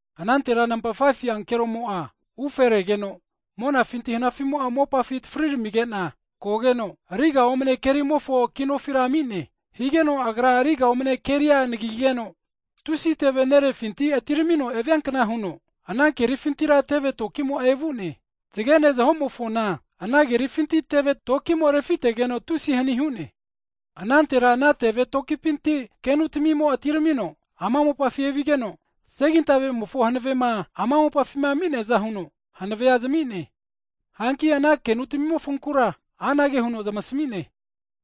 Anantera nampa 5fu ankeromo'a ufe regeno, monafinti hanafimo'a mopafi atafariramigena kogeno, riga omne kerimofo kinofira ami'ne. Higeno agra riga omne keria anagigeno, tusi teve nerefinti atiramino eviankna huno, ana kerifintira teve tokimo'a evu'ne. Zgene zahomofona ana kerifinti teve tokimo refitegeno tusi hani hu'ne. Anantera ana teve tokipinti kenutamimo atiramino ama mopafi evigeno, segintavemofo hanavema ama mopafima ami'neaza huno hanave zami'ne. Hanki ana kenutamimofonkura anage huno zmasamine,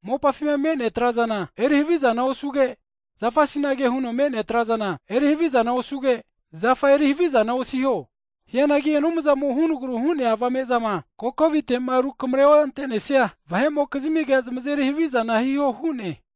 mopafima me'nea trazana eri havizana osuge, zafasinage huno me'nea trazana eri havizana osuge, zafa eri havizana osiho. Hianagi Anumzamo hunagru hu'nea avame'zama kokovitema rukamre onte'nesia vahe'mokizmige zmazeri havizana hiho hu'ne.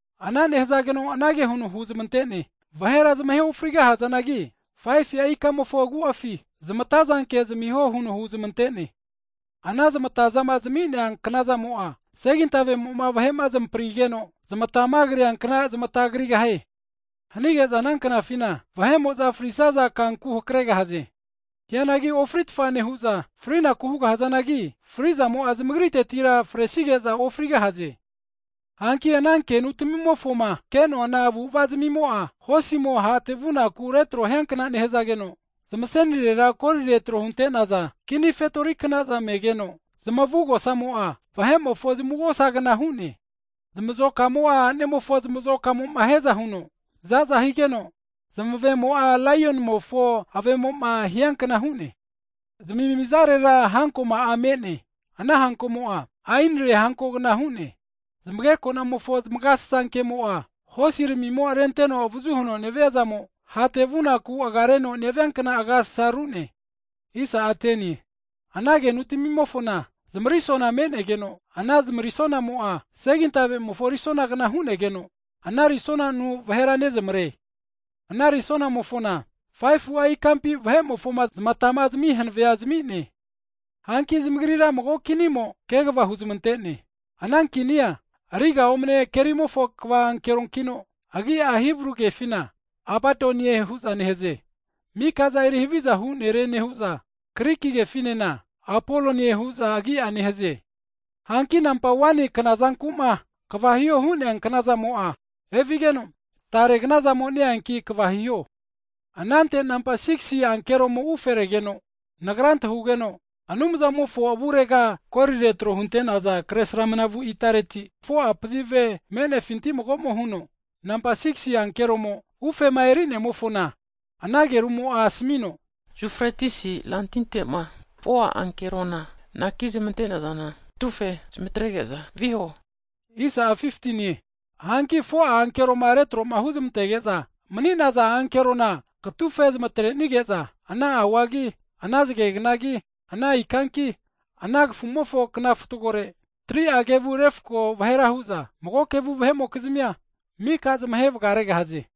Ana nehazageno anage huno huzmante'ne, vahera zmahe ofrigahazanagi, 5fu'a ikamofo agu'afi zmatazanke zmiho huno huzmante'ne. Ana zamatazama zami'nea knazamo'a segintavemo'ma vahe'ma zmaprigeno zmatama kriankna zmata krigahie. Hanige'za ana knafina vahe'mo'za frisaza kanku hakaregahaze. Hianagi ofritfa nehu'za, frinaku hugahazanagi frizamo'a zamagritetira fresige'za ofrigahaze. Hanki ana kenu tamimofoma ke'noana avu'ava'zmimo'a hosimo hate vunaku retro hiankna nehazageno, zmasenirera kolire tro hunte'naza kini fetori knaza megeno, zmavugosamo'a vahe'mofo zmavugosagna hu'ne. Zmazokamo'a anemofo zmazokamoma hiaza huno zaza higeno, zmavemo'a laionimofo avemo'ma hiankna hu'ne. Zamimizarera hankomo'a me'ne, ana hankomo'a, aenire hankogna hu'ne. Zmagekonamofo zmagasasa kemo'a, hosiramimo renteno avazu huno nevia zamo, hate vunaku agareno neviankna agasasaru'ne. Ana kenutamimofona zmarisona me'negeno, ana zmarisonamo'a segintavemofo risonagna hu'negeno ana risonanu vahera nezamare. Ana risonamofona 5fu'a ikampi vahe'mofona zmatama zami hanave'a zami'ne. Hanki zamagrira mago kinimo kegva huzmante'ne, ana kinia ariga omne kerimofo kva ankeronkino, agi'a Hibru kefina Abadonie (fri'ne hune) huza nehaze. Mikaza eri havizahu nere nehu'za, Griki kefinena Apolonie huza agi'a neheze. Hanki nampa 1ni knazankuma kva hiho hu'nea knazamo'a evigeno, tare knazamo ne-eanki kva hiho. Anante nampa 6si ankeroma uferegeno, nagra antahugeno Anumzamofo avurega kolire tro hunte'naza kresramnavu itareti 4'a pazive me'nefinti mago'mo huno, nampa 6gisi ankeromo ufema erinemofona ana agerumo'a asamino, Yufretis rantintema 4'a ankerona anaki zmantenazana katufe zmantrenke'za viho huno hu'ne. Hanki 4'a ankeroma retroma huzmantege'za mni'naza ankerona katufe zmatrenige'za ana auagi, ana zge knagi, ana ikanki, ana kafumofo kna fatgore, 3'a kevu refko vahera hu'za, mago kevu vahe'mokizmia mika zmahe vgaregahaze.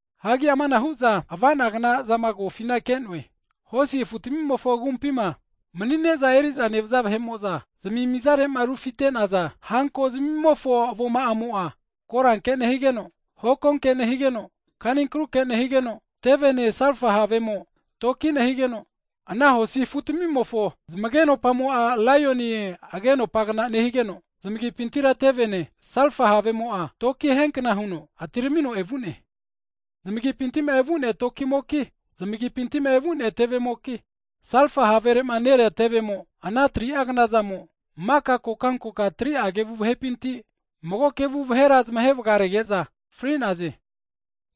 Hagi amanahu'za avanagnazama kofina ke'noe, hosi afu tamimofo agumpima mni'ne'za eri'za nevaza vahe'mo'za zmimizarema rufite'naza hanko zmimofo avoma'amo'a, koranke nehigeno, hokonke nehigeno, kaninkruke nehigeno, tevene salfa havemo toki nehigeno, ana hosi afutamimofo zmagenopamo'a laioni agenopagna nehigeno, zmagipintira tevene, salfa havemo'a toki hiankna huno atiramino evu'ne. Zmagipintima evu'nea tevemoki, salfa haverema nerea tevemo, ana 3'a knazamo maka kokankonka 3'a kevu vahepinti, mago kevu vahera zmahe vgarege'za fri'naze.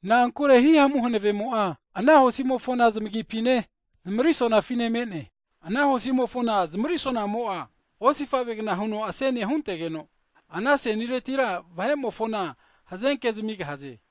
Na'ankure hihamu hanavemo'a ana hosimofona zamagipine zmarisonafine me'ne. Ana hosimofona zmarisonamo'a, osifavegna huno asenia huntegeno, ana aseniretira vahe'mofona hazenke zamigahaze.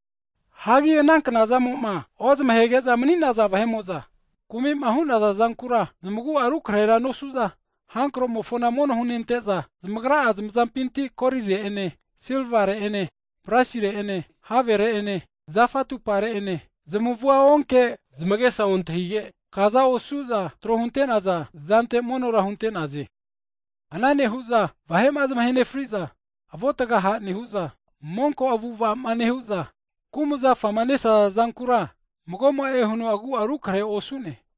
Hagi ana knazamo'ma ozmahege'za mni'naza vahe'mo'za, kumi'ma hu'naza zankura zmagu'a rukrehera nosu'za, hankromofona mono hunonte'za, zamagra'a zmazampinti kolire'ene silvare ene brasire'ene havere'ene, zafa atupare'ene, zmavua onkege zmagesa ontahige kaza osu'za tro hunte'naza zante monora hunte'naze. Ana nehu'za vahema zmahe nefriza, avuatga ha' nehu'za, monko avu'avama nehu'za, kumzafama nesaza zankura magomo'e huno agu'a rukrehe osu'ne.